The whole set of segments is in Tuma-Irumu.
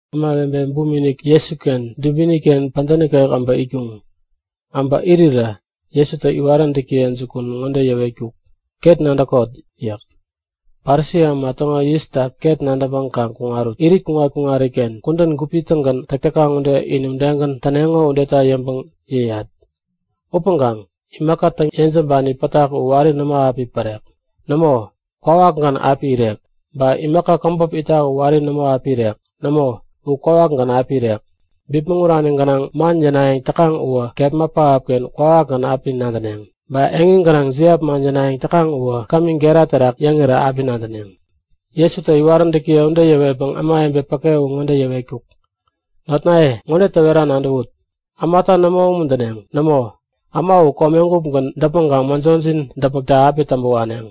Ämawebe buminik Jesuken dubini-ken pädä nikek äbä itkuŋ. Äbä irirä Jesutä iwaräntäkiye jukun ŋode yäwetkuk; Ket nadäkot! yäk. Parisi äma täŋo yista ket nadäŋpäŋ kaŋ kuŋarut. Irit kuŋat-kuŋariken kudän gupi-tägän täk täkaŋ ude in udegän täneŋo udeta yäŋpäŋ yäyat. Upäŋkaŋ imaka täŋ-yejämbani pätak u wari nämo api pärek. Nämo kwawakgän api irek. Ba imaka käbop itak u wari nämo api irek. Nämo, u kwawakgän api irek. Bipmäŋurani gänaŋ man yänayäŋ täkaŋ uwä kepma pähapken kwawakgän api nadäneŋ. Ba eŋi gänaŋ jiap man yänayäŋ täkaŋ uwä kami gera terak yäŋirä api nadäneŋ. Jesutä iwaräntäkiye ude yäwetpäŋ ämawebe päke u ŋode yäwetkuk; Notnaye, ŋode täwera nadäwut; Ämata nämo umuntäneŋ. Nämo, äma u komegupgän däpmäŋkaŋ mäjojin däpmäkta api täŋpä waneŋ.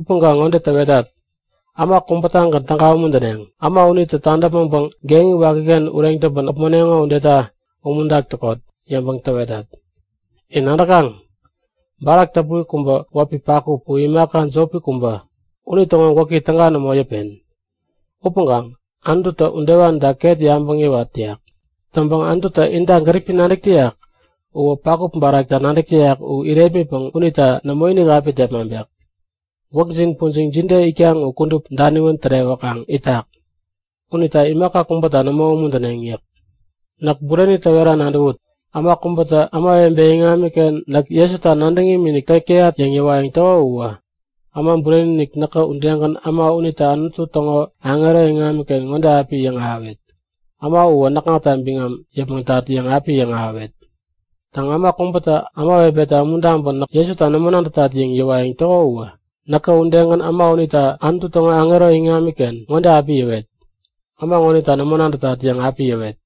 Upäŋkaŋ ŋode täwetat; Äma kubätagän täga umuntäneŋ. Äma unitä tadäpmäŋpäŋ geŋi wakiken ureŋ täŋpän äpmoneŋo udeta umuntak täkot yäŋpäŋ täwetat. In nadäkaŋ? Barak täpuri kubä wäpi pakup u imaka jopi kubä. Unitäŋo gwäki täga nämo yäpen. Upäŋkaŋ Anututä udewanita ket yabäŋ yäwat täyak. Täŋpäŋ Anututä inta gäripi nadäk täyak uwä pakup barakta nadäk täyak u irepmitak unita nämoinik api tepmaŋpek. Gwäkjin pujiŋ jide itkaŋ u kudup daniwän tärewäkaŋ itak. Unita imaka kubäta nämo umuntäneŋ yäk. Näk bureni täwera nadäwut; Äma kubätä ämawebe iŋamiken Näk Jesuta nadäŋ imikinik täk täyat yäŋ yäŋahäwayäŋ täko uwä, Äma Bureni-inik näkä udegän äma unita Anutu täŋo aŋero iŋamiken ŋode api yäŋahäwet; Äma uwä näkŋata biŋam yäpmäŋtat yäŋ api yäŋahäwet. Täŋ, äma kubä ämawebeta umuntaŋpäŋ Näk Jesuta nämo nadätat yäŋ yäwayäŋ täko uwä, näkä udegän äma unita Anutu täŋo aŋero iŋamiken ŋode api yäwet; Äma ŋonita nämo nadätat yäŋ api yäwet.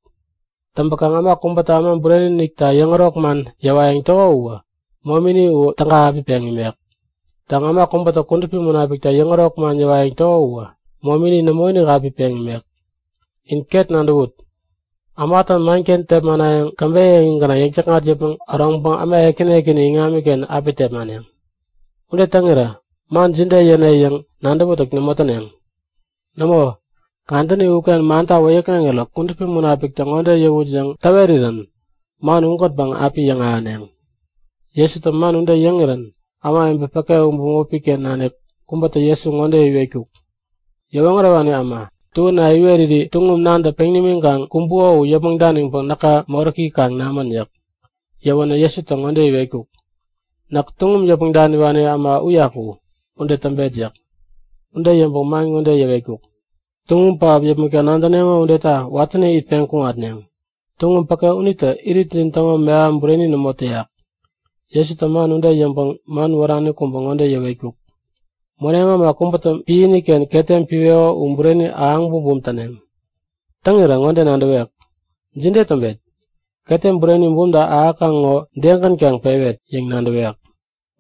Täŋpäkaŋ äma kubätä Äma Bureni-inikta yäŋärok man yäwayäŋ täko uwä momini u täga api peŋ imek. Täŋ, äma kubätä Kudupi Munapikta yäŋärok man yäwayäŋ täko uwä momini nämoinik api peŋ imek. In ket nadäwut! Ämatä manken tepmanayäŋ käbeyä eŋi gänaŋ yäŋ-täkŋat yäpmäŋ äroŋpäŋ äma ekäni ekäni iŋamiken api tepmaneŋ. Ude täŋirä man jide yäne yäŋ nadäwätäk nämo täneŋ. Nämo, kadäni uken manta wäyäkŋeŋirä Kudupi Munapiktä ŋode yäwut yäŋ täwerirä man ugänpäŋ api yäŋahäneŋ. Jesutä man ude yäŋirän ämawebe päke u bämopi-ken nanik kubätä Jesu ŋode iwetkuk; Yäwoŋärewani äma, tuäna iweriri tuŋum nantä peŋ nimiŋkaŋ kumbuko u yäpmäŋ daniŋpäŋ näka moräki kaŋ namän yäk. Yäwänä Jesutä ŋode iwetkuk; Näk tuŋum yäpmäŋ daniwani äma uyaku, ude täŋpet yäk. Ude yäŋpäŋ man ŋode yäwetkuk; Tuŋum pähap yäpmäkta nadäneŋo udeta watäni itpeŋ kuŋatneŋ. Tuŋum päke unitä iritjin täŋo meham bureni nämo täyak. Jesutä man ude yäŋpäŋ man wärani kubä ŋode yäwetkuk; Moneŋ äma kubätä piäni-ken ketem piweko u bureni ahäŋ bumbum täneŋ. Täŋirä ŋode nadäwek; Jide täŋpet? Ketem bureni bumta ahäkaŋ ŋo degän kaŋ pewet? yäŋ nadäwek.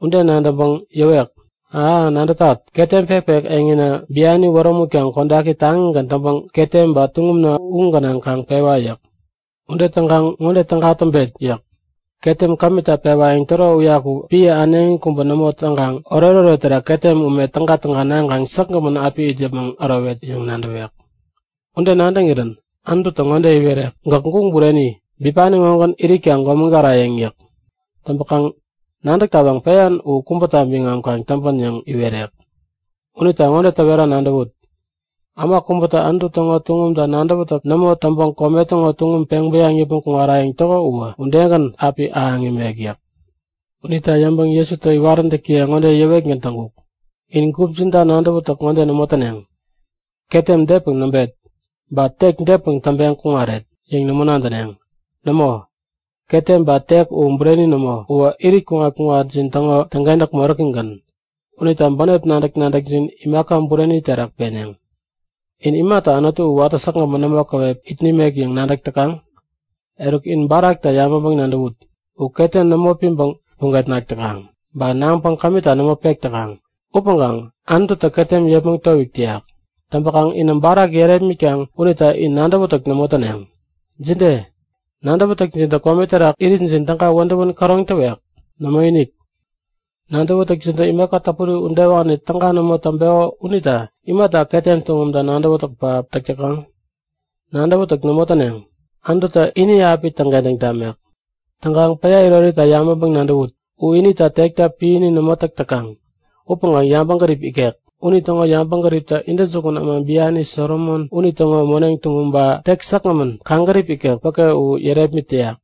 Ude nadäŋpäŋ yäwek; A! nadätat. Ketem pekpek eŋina biani wärämutpäŋ kodaki taŋigän täŋpäŋ ketem ba tuŋumna u gänaŋ kaŋ pewa! yäk. Ude täŋkaŋ ŋode täga nadäwet yäk. Ketem kämita pewayäŋ täro uyaku piä äneŋi kubä nämo täŋpäŋ oretoret terak ketem ume tägatäga naŋkaŋ säkgämän api it yäpmäŋ ärowet yäŋ nadäwek. Ude nadäŋirän Anututä ŋode iwerek; Gäk guŋ bureni! Bipani ŋogän iritka gomägarayäŋ yäk. Täŋpakaŋ nadäk tawaŋ peyan u kubäta biŋam kaŋ täŋpän yäŋ iwerek. Unita ŋode täwera nadäwut; Äma kubätä Anutu täŋo tuŋumta nadäwätäk nämo täŋpäŋ kome täŋo tuŋum peŋ bäyaŋ yäpmäŋ kuŋarayäŋ täko uwä udegän api ahäŋ imek yäk. Unita yäŋpäŋ Jesutä iwaräntäkiye ŋode yäwetgän täŋkuk; In gupjinta nadäwätäk ŋode nämo täneŋ; Ketem depäŋ näŋpet? Ba tek depäŋ täŋpäŋ kuŋaret? yäŋ nämo nadäneŋ. Nämo, ketem ba tek u bureni nämo. Uwä irit kuŋat-kuŋatjin täŋo täŋkentäk moräkigän. Unita bänep nadäk-nadäkjin imaka bureni terak peneŋ. In imata Anutu u watä säkgämän nämo käwep it nimek yäŋ nadäk täkaŋ? Eruk, in barakta yabäŋpäŋ-nadäwut! U ketem nämo piŋpäŋ puget nak täkaŋ, ba naŋpäŋ kämita nämo pek täkaŋ. Upäŋkaŋ Anututä ketem yepmäŋ towik täyak. Täŋpäkaŋ inä barak yärepmitkaŋ unita in nadäwätäk nämo täneŋ. Jide? Nadäwätäkjintä kome terak iritjin täga wädäwän käroŋ täwek? Nämoinik! Nadäwätäkjintä imaka täpuri udewani täga nämo täŋpeko unita imata ketem tuŋumta nadäwätäk pähap täk täkaŋ? Nadäwätäk nämo täneŋ. Anututä ini api täŋkentäŋ tamek. Täŋkaŋ päya irorita yabäŋpäŋ-nadäwut. U inita tekta piäni nämo täk täkaŋ upäŋkaŋ yabäŋgärip ikek. Unitäŋo yabäŋgäriptä intäjukun äma biani Solomon unitäŋo moneŋ tuŋum ba tek säkgämän kaŋgärip ikek päke u yärepmit täyak.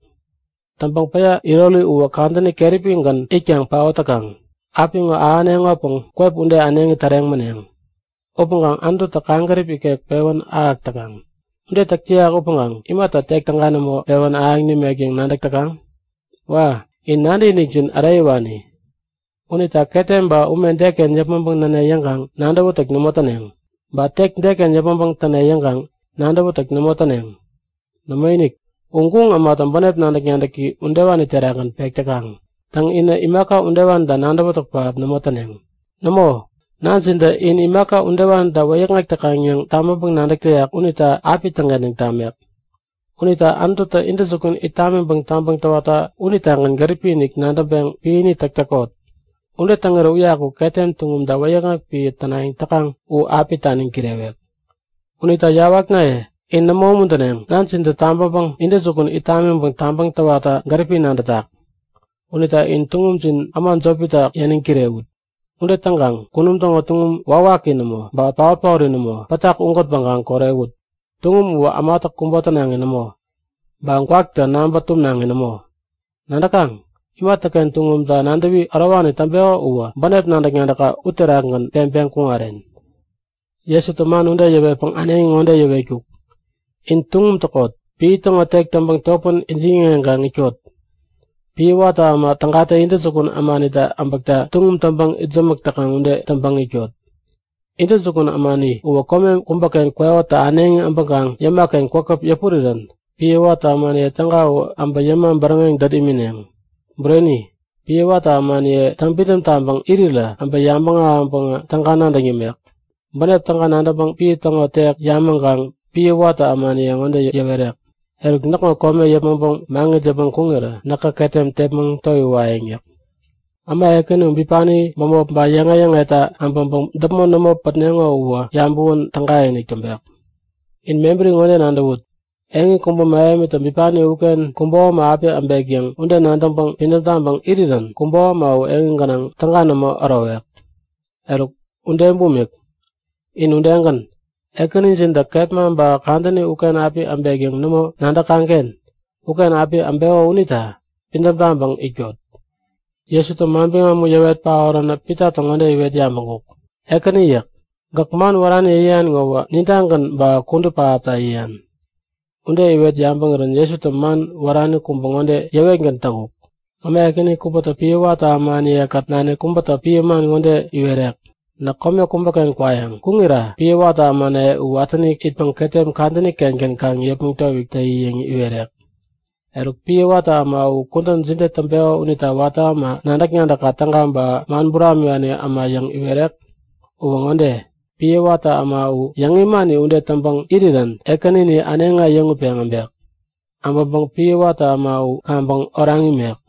Täŋpäŋ päya irori uwä kadäni keräpigän itpäŋ paot täkaŋ. Apiŋo ahäneŋopäŋ kwep ude äneŋi täreŋ mäneŋ. Upäŋkaŋ Anututä kaŋgärip ikek pewän ahäk täkaŋ. Ude täk täyak upäŋ imata tek täga nämo pewän ahäŋ nimek yäŋ nadäk täkaŋ? Wa! In nadäkinikjin äreyäwani! Unita ketem ba ume deken yäpmäŋpäŋ näne yäŋkaŋ nadäwätäk nämo täneŋ. Ba tek deken yäpmäŋpäŋ täne yäŋkaŋ nadäwätäk nämo täneŋ. Nämoinik! U guŋ ämatä bänep nadäk-nadäki udewani terakgän pek täkaŋ. Täŋ, inä imaka udewanita nadäwätäk pähap nämo täneŋ. Nämo, nanjintä in imaka udewanita wäyäkŋek täkaŋ yäŋ tabäŋpäŋ-nadäk täyak unita api täŋkentäŋ tamek. Unita Anututä intäjukun it tamiŋpäŋ tabäŋ täwatta unitagän gäripi-inik nadäŋpeŋ piäni täk täkot. Ude täŋirä uyaku ketem tuŋumta wäyäkŋek piä tänayäŋ täkaŋ u api taniŋ kirewek. Unita yawaknaye, in nämo umuntäneŋ. Nanjintä tämagutpäŋ intäjukun it tamiŋpäŋ tabäŋ täwatta gäripi nadätak. Unita in tuŋumjin äma jopita yäniŋ kirewut. Ude täŋkaŋ kunum täŋo tuŋum wawaki nämo, ba paot-paori nämo pätak ugänpäŋ kaŋ korewut. Tuŋum uwä ämatä kubo tänaŋi nämo ba gwaktä naŋpä tumnaŋi nämo. Nadäkaŋ? Imatäken tuŋumta nadäwi ärowani täŋpeko uwä bänep nadäk-nadäkka uterakgän peŋpäŋ kuŋaren. Jesutä man ude yäwetpäŋ äneŋi ŋode yäwetkuk; In tuŋum täkot! Piä täŋo tek täŋpäŋ topän ijiŋ-yäŋeŋkaŋ itkot. Piä watä äma tägatä intäjukun ämanitä äbäkta tuŋum täŋpäŋ itsämäk täkaŋ ude täŋpäŋ itkot. Intäjukun ämani uwä kome kubäken kwekotä äneŋi äbäŋpäŋ yäma-ken kwäpkwäp yäpurirän piä watä ämaniye täga u äbä yäma bäräŋeŋ dät imineŋ. Bureni, piä watä ämaniyetä täŋpidäm taŋpäŋ irirä äbä yabäŋ ahäŋpäŋä täga nadäŋ yämek. Bänep täga nadäŋpäŋ piä täŋo tek yamäŋkaŋ piä watä ämaniye ŋode yäwerek; Eruk näkŋo kome yäpmäŋpäŋ maŋit yäpmäŋ kuŋirä näkä ketem tepmäŋ towiwayäŋ yäk. Äma ekäni u bipani bämop ba yäŋe-yäŋeta äbäŋpäŋ däpmon nämo pätneŋo uwä yabäwän tägainik täŋpek. In mebäri ŋode nadäwut; Eŋi kubä mähemitä bipani uken kubo äma api äbek yäŋ, ude nadäŋpäŋ pidäm taŋpäŋ irirän kubo äma u eŋi gänaŋ täga nämo ärowek. Eruk ude bumik, in udegän Ekänijintä kepma ba kadäni uken api äbek yäŋ nämo nadäkaŋ-ken uken api äbeko unita pidäm taŋpäŋ itkot. Jesutä manbiŋam u yäwet paoränä Pitatä ŋode iwet yabäŋkuk; Ekäni yäk. Gäk man wärani yäyan ŋowä, nintagän ba kudup pähapta yäyan? Ude iwet yabäŋirän Jesutä man wärani kubä ŋode yäwetgän täŋkuk; Äma ekäni kubätä piä watä ämaniye-kät nanik kubäta piä man ŋode iwerek; Näk kome kubäken kwayäŋ. Kuŋarira piä watä ämanaye u watäni itpäŋ ketem kadäni-kengän kaŋ yepmäŋ towik täyi yäŋ iwerek. Eruk, piä watä äma u kudän jide täŋpeko unita watä äma nadäk-nadäkka täga ba man buramiwani äma yäŋ iwerek? Uwä ŋode; Piä watä äma u, yäŋ imani ude täŋpäŋ irirän ekänini äneŋi äyäŋutpeŋ äbek. Äbäŋpäŋ piä watä äma u kaŋpäŋ oraŋ imek.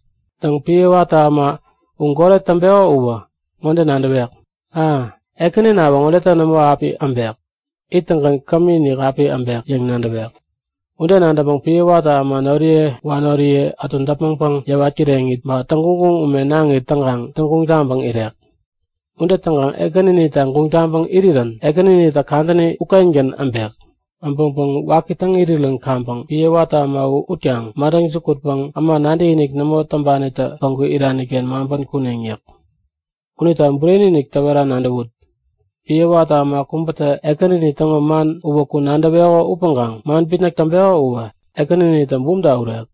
Täŋ, piä watä äma u goret täŋpeko uwä ŋode nadäwek; A! Ekäninawä ŋodetä nämo api äbek! Ittäŋgän kämiinik api äbek yäŋ nadäwek. Ude nadäŋpäŋ piä watä äma noriye wanoriye ätu däpmäŋpäŋ yäwat kireŋit, ba täŋguŋguŋ ume naŋit täŋkaŋ täŋguŋ taŋpäŋ irek. Ude täŋkaŋ ekäninita guŋ taŋpäŋ irirän ekänitä kadäni ukengän äbek. Äbäŋpäŋ waki täŋ irirän kaŋpäŋ piä watä äma u utkaŋ madäŋ jukutpäŋ äma nadäkinik nämo täŋpanitä päŋku irani-ken maŋpän kuneŋ yäk. Unita bureni-inik täwera nadäwut; Piä watä äma kubätä ekänini täŋo man uwäku nadäweko upäŋkaŋ man bitnäk täŋpeko uwä ekäninitä bumta urek.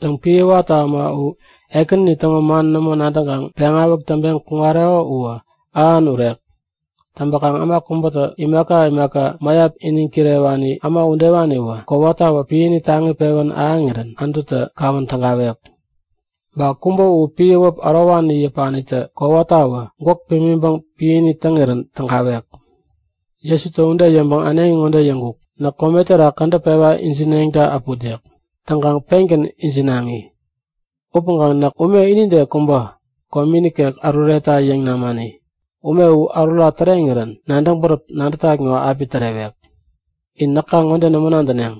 Täŋ, piä watä äma u ekänini täŋo man nämo nadäŋkaŋ peŋawäk täŋpeŋ kuŋareko uwä ähan urek. Täŋpäkaŋ äma kubätawä imaka imaka mäyap iniŋ kirewani äma udewaniwä kowatawä piäni taŋi pewän ahäŋirän Anututä kawän tägawek. Ba kubä u piä wäp ärowani yäpanitä kowatawä gwäk pimiŋpäŋ piäni täŋirän tägawek. Jesutä ude yäŋpäŋ äneŋi ŋode yäŋkuk; Näk kome terak kädäp pewä ijineŋta äput yäk. Täŋkaŋ pengän ijinaŋi. Upäŋkaŋ näk ume inide kubä, komi nikek äruretta yäŋ namani. Ume u ärura täreŋirän nadäŋ bäräp nadätat ŋo api tärewek. In näka ŋode nämo nadäneŋ;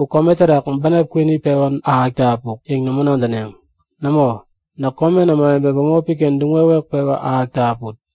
U kome terak bänep kwini pewa ahäkta äpuk yäŋ nämo nadäneŋ. Nämo, näk komen ämawebe bämopi-ken duŋ-wewek pewa ahäkta äput.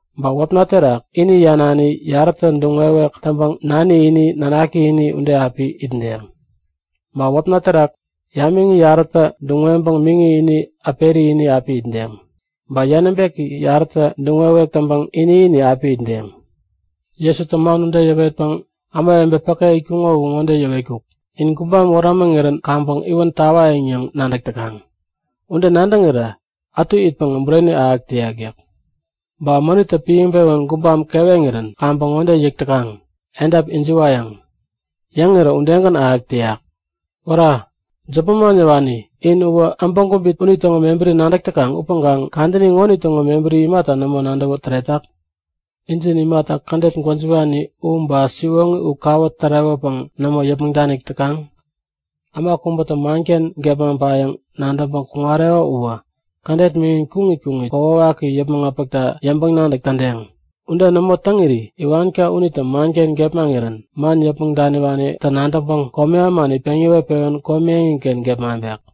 Ba wäpna terak ini yanani yarätä duŋ-wewek täŋpäŋ nani ini, nanaki ini ude api itdeŋ. Ba wäpna terak yamiŋi yarätä duŋ-weŋpäŋ miŋi ini, äperi ini api itdeŋ. Ba yanäbeki yarätä duŋ-wewek täŋpäŋ ini-ini api itdeŋ. Jesutä man ude yäwetpäŋ ämawebe päke itkuŋo u ŋode yäwetkuk; In gubam wärämäŋirän kaŋpäŋ iwän tawayäŋ yäŋ nadäk täkaŋ. Ude nadäŋirä ätu itpäŋä bureni ahäk täyak yäk. Ba mänittä piäŋpewän gubam keweŋirän kaŋpäŋ ŋode yäk täkaŋ; Edap ijiwayäŋ. Yäŋirä udegän ahäk täyak. Wära! Jop manman yäwani in uwä äbäŋ kubit unitäŋo mebäri nadäk täkaŋ upäŋkaŋ kadäni ŋonitäŋo mebäri imata nämo nadäwä täretak? Injin imata kädet gwäjiwani u ba, siwoŋi u kawä tärewäpäŋ nämo yäpmäŋ danik täkaŋ? Äma kubätä manken gepmaŋpayäŋ nadäŋpäŋ kuŋareko uwä kädet miŋin kuŋit kuŋit kokwawaki yäpmäŋ äpäkta yäŋpäŋ-nadäk tädeŋ. Ude nämo täŋiri iwanka unitä manken gepmaŋirän man yäpmäŋ daniwanitä nadäŋpäŋ komi ämani peŋ iwet-pewän komi eŋiken gepmaŋpek.